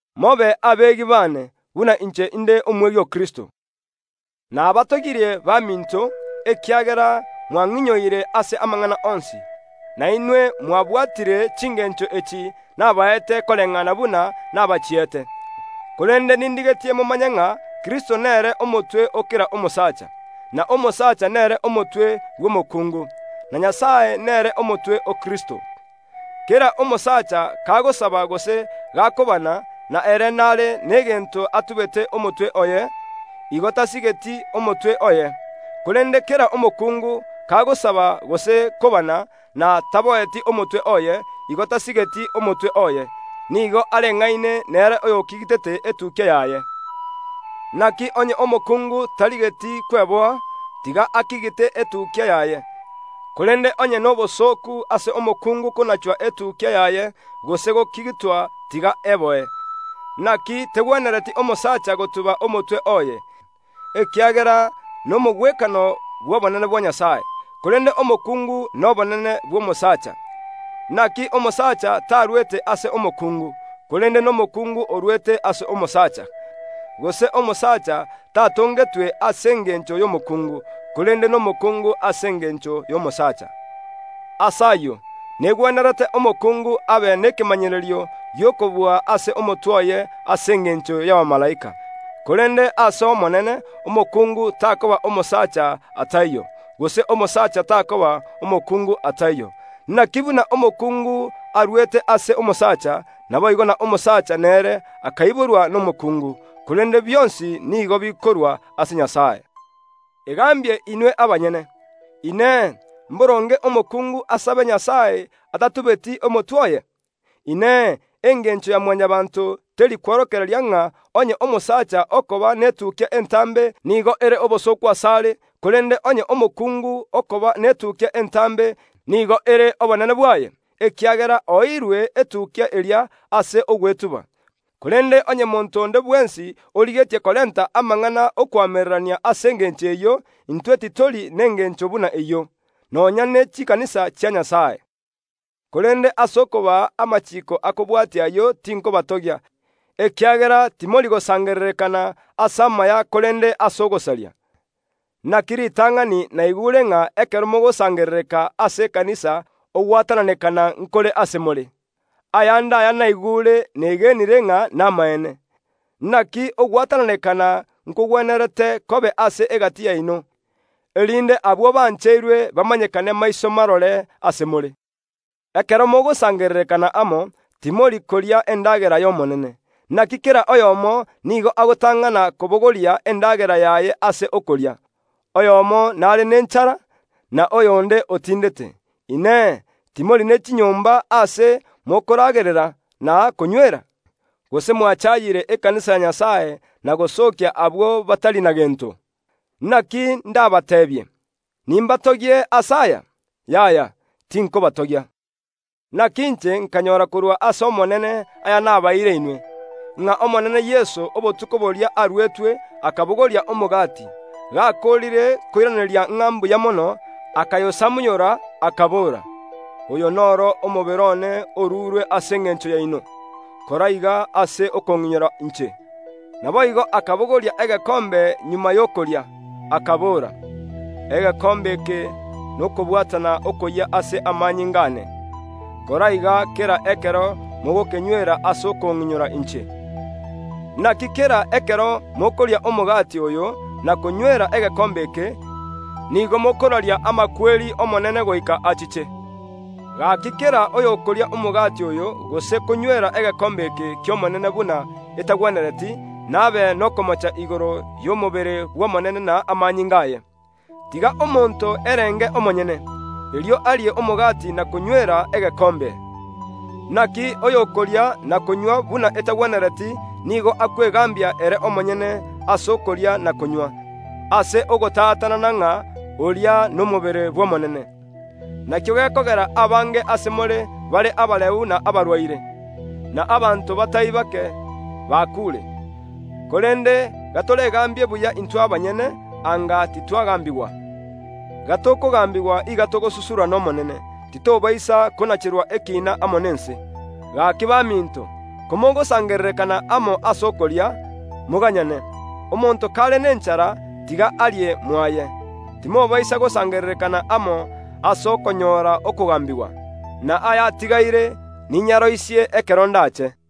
Mobe abegi baane, buna inche inde omwegi o Kristo. Nabatogirie baminto, ekiagera mwang’inyoire ase amang’ana onsi, na inwe mwabwatire chingencho echi nabaete koreng’ana buna nabachiete. Korende nindigetie momanye ng’a Kristo nere omotwe o kera omosacha; na omosacha nere omotwe bw’omokuungu; na Nyasae nere omotwe o Kristo. Kera omosacha kagosaba gose gakobana, na ere nare negento atubete omotwe oye, igo tasigeti omotwe oye. Korende kera omokungu kagosaba gose kobana na taboeti omotwe oye, igo tasigeti omotwe oye, nigo areng’aine nere oyogingerete etukia yaye. Naki onye omokungu tarigeti kweboa, tiga agingire etukia yaye; korende onye nobosooku ase omokungu konachwa etukia yaye gose kogingirwa tiga eboe. Naki tegwenereti omosacha gotuba omotwe oye, ekiagera nomogwekano bw’obonene bwa Nyasae; korende omokungu nobonene bw’omosaacha. (Naki omosacha tarwete ase omokungu, korende nomokuungu orwete ase omosacha. Gose omosacha tatongetwe ase engencho y’omokuungu, korende nomokuungu ase engencho y’omosaacha.) Ase ayio negwenerete omokungu abe nekemanyererio gi’okobua ase omotwe oye ase engencho y’abamalaika. (Korende ase Omonene omokungu takoba omosacha ataiyo, gose omosacha takoba omokungu ataiyo. Naki buna omokungu arwete ase omosacha, naboigo na omosacha nere akoiborwa nomokuungu, korende bionsi nigo bikorua ase Nyasae.) Egambie inwe abanyene. Inee! Mboronge omokungu asabe Nyasae atatubeti omotwe oye? Inee! Engencho ya Mwanyabaanto teri kworokereria ng’a onye omosacha okoba netukia entambe nigo ere obosooku asare, korende onye omokungu okoba netukia entambe nigo ere obonene bwaye? Ekiagera oeirwe etukia eria ase ogwetuba. Korende onye monto onde bwensi origetie korenta amang’ana ’okoamererania ase engencho eyio, intwe titori nengencho buna eyio, nonya ne chikanisa chia Nyasae. Korende ase okobaa amachiiko akobwatia ayio tinkobatogia, ekiagera timori gosangererekana ase amaya korende ase ogosaria. Naki ritang’ani naigure ng’a ekero mogosangerereka ase ekanisa ogwatananekana nkore ase more. Ayande aya naigure negenire ng’a namaene. Naki ogwatananekana nkogwenerete kobe ase egati yaino, erinde abwo bare abeekeene bamanyekane maiso marore ase more. Ekero mogosangererekana amo, timori koria endagera y’Omonene; naki kera oyomo nigo agotang’ana kobogoria endagera yaye ase okoria, oyomo nare nenchara, na oyonde otindete. Inee! Timori ne chinyomba aase mokoragerera na konywera? Gose mwachayire ekanisa ya Nyasae na gosookia abwo batari na gento? Naki ndabateebie? Nimbatogie ase aya? Yaya, tinkobatogia. Naki inche nkanyora korwa ase Omonene aya nabaeire inwe, ng’a Omonene Yeso obotuko boria aruetwe akabogoria omogati, gakoorire koiraneria ng’a mbuya mono, akayosamunyora, akabora karie, “Oyo noro omobere one orurwe ase engencho yaino; kora iga ase okong’inyora inche.” Naboigo akabogoria egekombe magega y’okoria, akabora, “Egekombe eke nokobwatana okoyia ase amanyinga aane; kora iga kera ekero mogokenywera ase okong’inyora inche.” Naki kera ekero mokoria omogati oyo na konywera egekombe eke, nigo mokoraria amakweri y’Omonene goika achiche. Gaki kera oyokoria omogati oyo gose konywera egekombe eke ki’Omonene buna etagwenereti nabe nokomocha igoro y’omobere bw’Omonene na amanyinga aye. Tiga omonto erenge omonyene, erio arie omogati na konywera egekombe. Naki oyokoria na konywa buna etagwenereti nigo akwegambia ere omonyene ase okoria na konywa, ase ogotatanana ng’a oria nomobere bw’Omonene. Nakio gekogera abange ase more bare abareu na abarwaire, na abanto batari bake bakuure. Korende gatoregambie buya intwe abanyene, anga titwagambigwa. Gatokogambigwa iga togosusurwa n’Omonene, titobaisa konacherwa ekiina amo nense. Gaki baminto, komogosangererekana amo ase okoria, moganyane. Omonto kare nenchara, tiga arie mwaye, timobaisa gosangererekana amo ase okonyora okogambigwa. Na aya atigaire ninyaroisie ekero ndache.